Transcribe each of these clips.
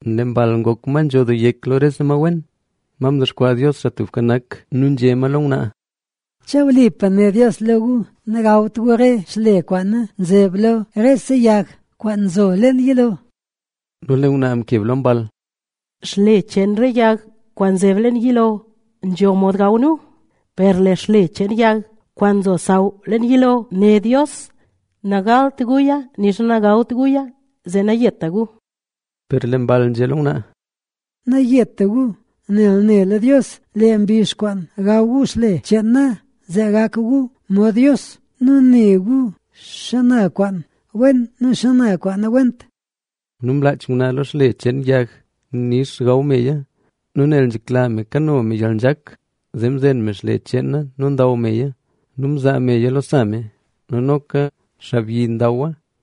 Lee mball ngok ma nzho doo yek lo rese ma wen, ma mdexkwaa Dios, Xaa Tubka Nak. Nu nzhé ma lo ngwnaa: —¿Che wlipa né Dios lo gu nagawt gu re xle kwaan zeb lo rese yag, kwaan nzo leen yilo? Nu lee ngwnaa mkeb lo mball: —Xle cheen re yag kwaan nzeb leen yilo nzho mod gaw nu. Per lee xle cheen yag kwaan nzo xsaw leen yilo né Dios: “Nagawt guya nixa nagalt guya, zee nayeta gu”. Per lee mball nzhé lo ngwnaa: —Nayeta gu. Nel nela Dios, lee mbizh kwaan gaw gu xle cheena, zee gak gu mod Dios nu ne gu xana kwaan wen nu xana kwaan nawent. Nu mlaach ngwnaa lo xle cheen yag nix gaw meya. Nu nel nzhekla me kano me yalnzhak, zee mzen me xle cheena nu ndaw meya. Nu mzaa meya lo sa me nu noka xaabyi ndawa.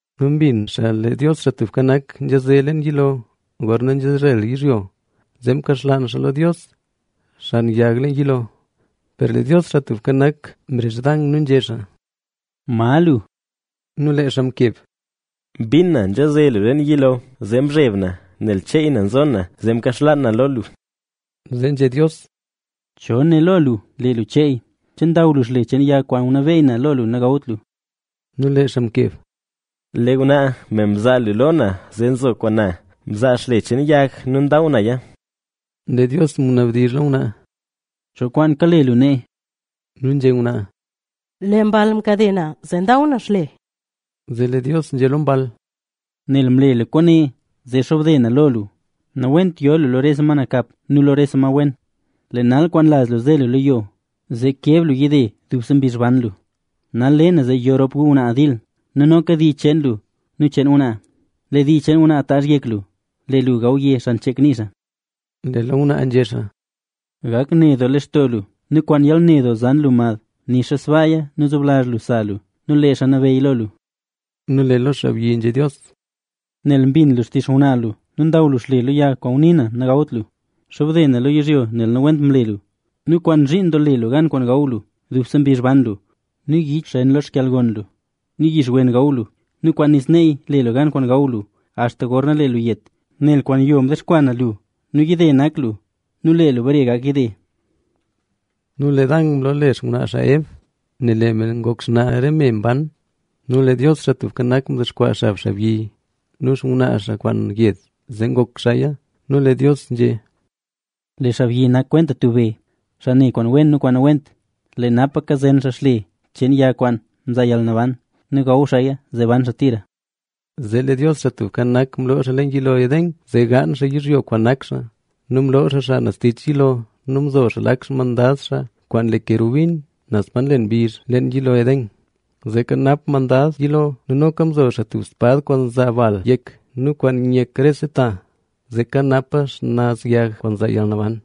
Nu mbin xaa lee Dios, Xaa Tubka Nak, nzhaze leen yilo, gorna nzezhel yizhyo, zee mkaxlaan xaa lo Dios, xan yag leen yilo. Per lee Dios, Xaa Tubka Nak, mrezh Dan nu nzhé xaa: —¿Ma lu? Nu lee xaa mkeb: —Mbin na nzhaze lu leen yilo, zee mzheb na, nel cheey na nzo na, zee mkaxlaan na lo lu. Zee nzhé Dios: —¿Cho né lo lu, lee lu cheey? ¿Che ndaw lu xle cheen yag kwaan ngunabeyy na lo lu nagawt lu? Nu lee xaa mkeb: —Lee ngwnaa, me mzaa lu lo na zee nzo kwaan na, mzaa xle cheen yag nu ndaw naya. Lee Dios ngunabdizh lo ngwnaa: —¿Cho kwaan kale lu nee? Nu nzhé ngwnaa: —Lee mball mkade na, zee ndaw na xle. Zee lee Dios nzhé lo mball: —Nel mle lu kwaane, zee xobde na lo lu, “Nawent yo lu lo rese ma nakap nu lo rese ma wen. Lee nal kwaan laz lu ze lu lo yo, zee keb lu yide dubse mbizh ban lu. Nal le na zee yo rop gu ngwnaa dil, nu noka dii cheen lu nu cheen ngwnaa. Lee dii cheen ngwnaa taazh yek lu, lee lu gawye xan chek nii xaa.” Lee lo ngwnaa nzhé xaa: —Gak ne doo lextoo lu nu kwaan yalne doo zan lu mad. Nixa sbaaya nu nzoblazh lu sa lu nu lee xaa nabeyy lo lu. Nu lee lo xaabyi nzhé Dios: —Nel mbin lu xtizh xngwnaa lu nu ndaw lu xle lo yag kwaan ngunii na nagawt lu, xobde na lo yizhyo, nel nawent mle lu nu kwaan zhiin doo le lu gan kwaan gaw lu, dubse mbizh ban lu. Nu yich xen lo yalgon cheen lu nu yix wen gaw lu. Nu kwaan nis neey le lu gan kwaan gaw lu, axta gorna lee lu yet, nel kwaan yo mdexkwaa na lu nu yide nak lu nu lee lu bare gak yide. Nu lee Dan mloole xngwnaa xaa Eb,a nel lee me ngok xnaa re me mban. Nu lee Dios, Xaa Tubka Nak, mdexkwaa xaa xab xaabyi nu xngwnaa xaa kwaan yed, zee ngok xaaya. Nu lee Dios nzhé: —Lee xaabyi nak kwenta tub be, xaa ne kwaan wen nu kwaan nawent. Lee napa kazen xaa xle cheen yag kwaan nzaa yalnaban nu gaw xaaya, zee ban xaa tira. Zee lee Dios, Xaa Tubka Nak, mloo xaa leen yilo Edén, zee gaan xaa yizhyo kwaan nak xaa. Nu mloo xaa xaa naz tich yilo nu mzo xaa lak xmandad xaa kwaan le kerubin naz pa nlen mbizh leen yilo Edén, zee kanap mandad yilo. Nu noka mzo xaa tub spad, kwaan nzaa bal yek nu kwaan nyek rese ta, zee kanapa xnaz yag kwaan nzaa yalnaban.